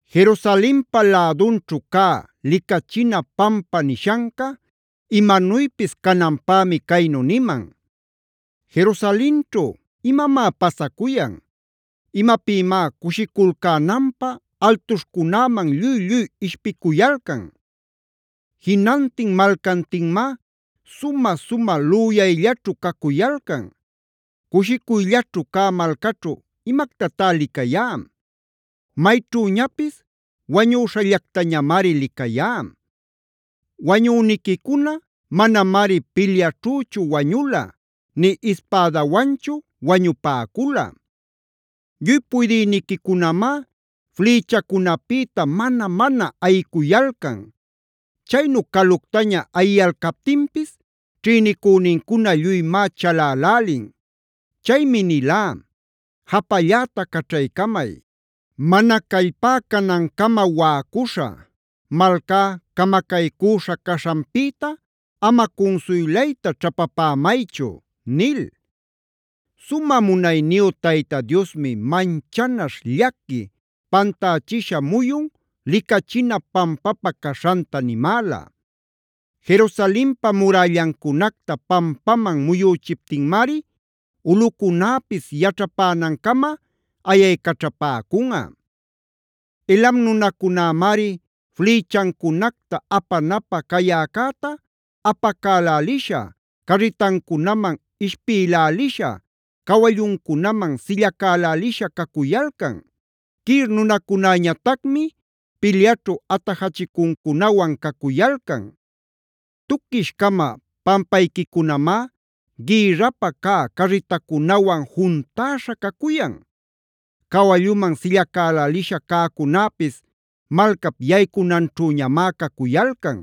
Jerusalenpa lädunćhu cä Licachina Pampa nishanca imanuypis cananpämi caynu niman: Jerusalenćhu, ¿imamá pasacuyan? ¿Imapïmá cushiculcänanpä altuśhcunäman lluy-lluy ishpicuyalcan? Jinantin malcantinmá sumä-sumä lüyayllaćhu cacuyalcan. Cushicuyllaćhu cä malcaćhu ¿imactatá licayá? Mayćhüñapis wañüśhallactañamari licayá. Wañüniquicuna manamari pilyaćhüchu wañula nï ispädawanchu wañupäcula. Lluy puydïniquicunamá flïchacunäpïta mana-mana ayicuyalcan. Chaynu caluctaña ayiyalcalptinpis ćhïnicünincuna lluymá chalälälin. Chaymi nilá: “Japalläta caćhaycamay; mana callpá canancama waꞌacuśhä. Malcá camacaycüśha caśhanpïta ama cunsuylayta ćhapapämaychu” nil. Sumä munayniyu Tayta Diosmi manchanaśh, llaqui, pantächisha muyun Licachina Pampapä caśhanta nimäla. Jerusalenpa murällancunacta pampaman muyüchiptinmari ulꞌucunäpis yaćhapänancama ayaycaćhapäcunꞌa. Elam nunacunämari flïchancunacta apanapä cayäcäta apacälälisha, carritancunaman ishpïlälisha, cawalluncunaman sillacalälisha cacuyalcan. Kir nunacunäñatacmi pilyaćhu atajachicuncunawan cacuyalcan. Tuquish-cama pampayquicunamá gïrrapä cä carritacunawan juntäśha cacuyan. Cawalluman sillacälälisha cäcunäpis malcap yaycunanćhüñamá cacuyalcan.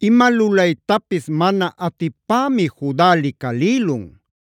¡Ima lulaytapis mana atipämi Juda licalïlun!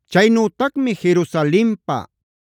Chaynütacmi Jerusalenpab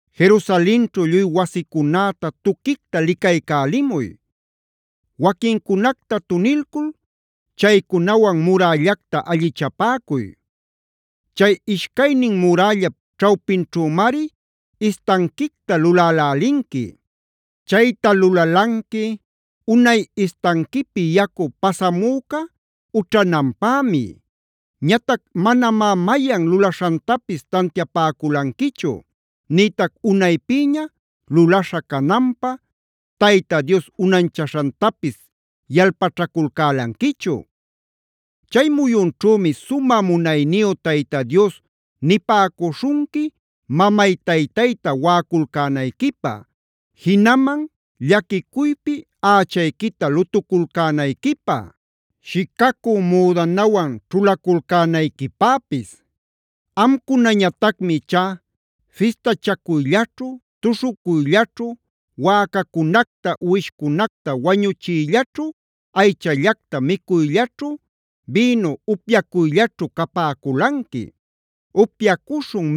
Jerusalenćhu lluy wasicunäta tuquicta licaycälimuy; waquincunacta tunilcul chaycunawan murällacta allichapäcuy. Chay ishcaynin murällap ćhawpinćhümari istanquicta lulälälinqui; chayta lulalanqui unay istanquipi yacu pasamüca ućhananpämi. Ñatac manamá mayan lulaśhantapis tantiapäculanquichu nïtac unaypïña lulaśha cananpä Tayta Dios unanchaśhantapis yalpaćhaculcälanquichu. Chay muyunćhümi sumä munayniyu Tayta Dios nipäcuśhunqui mamay-taytayta waꞌaculcänayquipä, jinaman llaquicuypi ächayquita lutuculcänayquipä, shicacü müdanawan ćhulaculcänayquipäpis. Amcunañatacmi ichá fistachacuyllaćhu, tuśhucuyllaćhu, wäcacunacta uwishcunacta wañuchiyllaćhu, aychallacta micuyllaćhu, bïnu upyacuyllaćhu capäculanqui: “Upyacuśhun,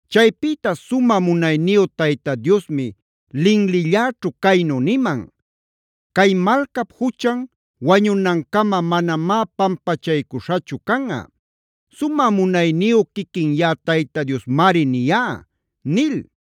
Chaypïta sumä munayniyu Tayta Diosmi linlilläćhu caynu niman: “Cay malcap juchan wañunancama manamá pampachaycuśhachu canꞌa. Sumä munayniyu quiquin yaꞌa Tayta Diosmari niyá” nil.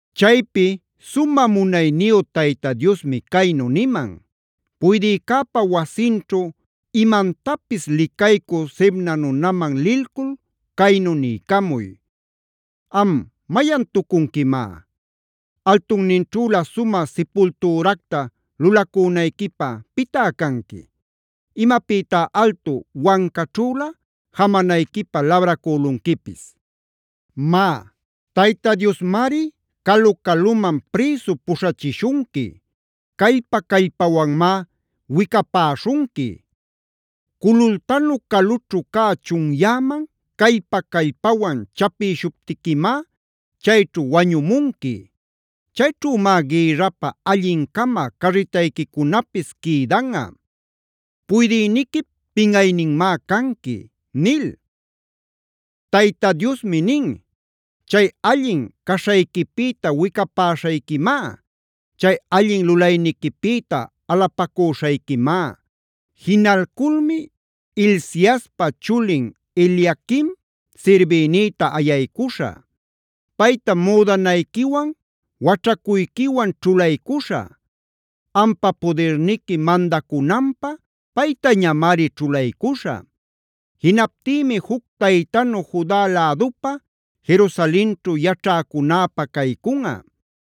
Chaypi sumä munayniyu Tayta Diosmi caynu niman: “Puydïcäpa wasinćhu imantapis licaycü Sebnaf nunaman lilcul caynu niycamuy: “¿Am, mayantucunquimá? ¿Altunninćhülä sumä sipultüracta lulacünayquipä pitá canqui? ¿Imapïtá altu wancaćhülä jamanayquipä labracülunquipis? Má, Tayta Diosmari calu-caluman prïsu puśhachishunqui; callpa callpawanmá wicapäśhunqui. Culultanu calućhu cä chunyäman, callpa-callpawan chapïshuptiquimá chayćhu wañumunqui. Chayćhümá gïrrapä allin-cama cärritayquicunapis quïdanꞌa. ¡Puydïniquip pinꞌayninmá canqui!” nil. Tayta Diosmi nin: “Chay allin caśhayquipïta wicapäśhayquimá; chay allin lulayniquipïta alapacüśhayquimá. Jinalculmi Hilciaspa chulin Eliaquim sirbïnïta ayaycuśhä. Paytam müdanayquiwan, waćhacuyquiwan ćhulaycuśhä; ampa pudirniqui mandacunanpä paytañamari ćhulaycuśhä. Jinaptïmi juc taytanu Juda lädupä, Jerusalenćhu yaćhäcunäpä caycunꞌa.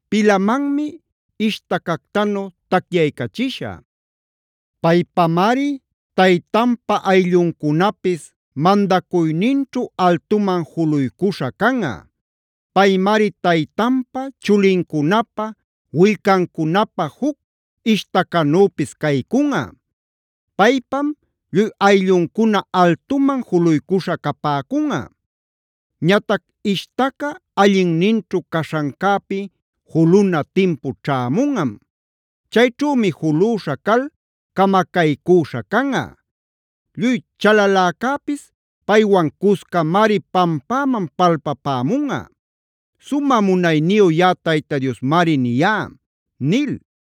Pilamanmi ishtacactanu tacyaycachishä; paypamari taytanpa aylluncunapis mandacuyninćhu altuman juluycuśha canꞌa. Paymari taytanpä, chulincunapä, willcancunapäh juc ishtacanüpis caycunꞌa; paypam lluy aylluncuna altuman juluycuśha capäcunꞌa. “Ñatac ishtaca allinninćhu caśhancäpi juluna timpu ćhämunꞌam. Chayćhümi julüśha cal camacaycüśha canꞌa. Lluy chalaläcäpis paywan cuscamari pampäman palpämunꞌa. Sumä munayniyu yaꞌa Tayta Diosmari niyá” nil.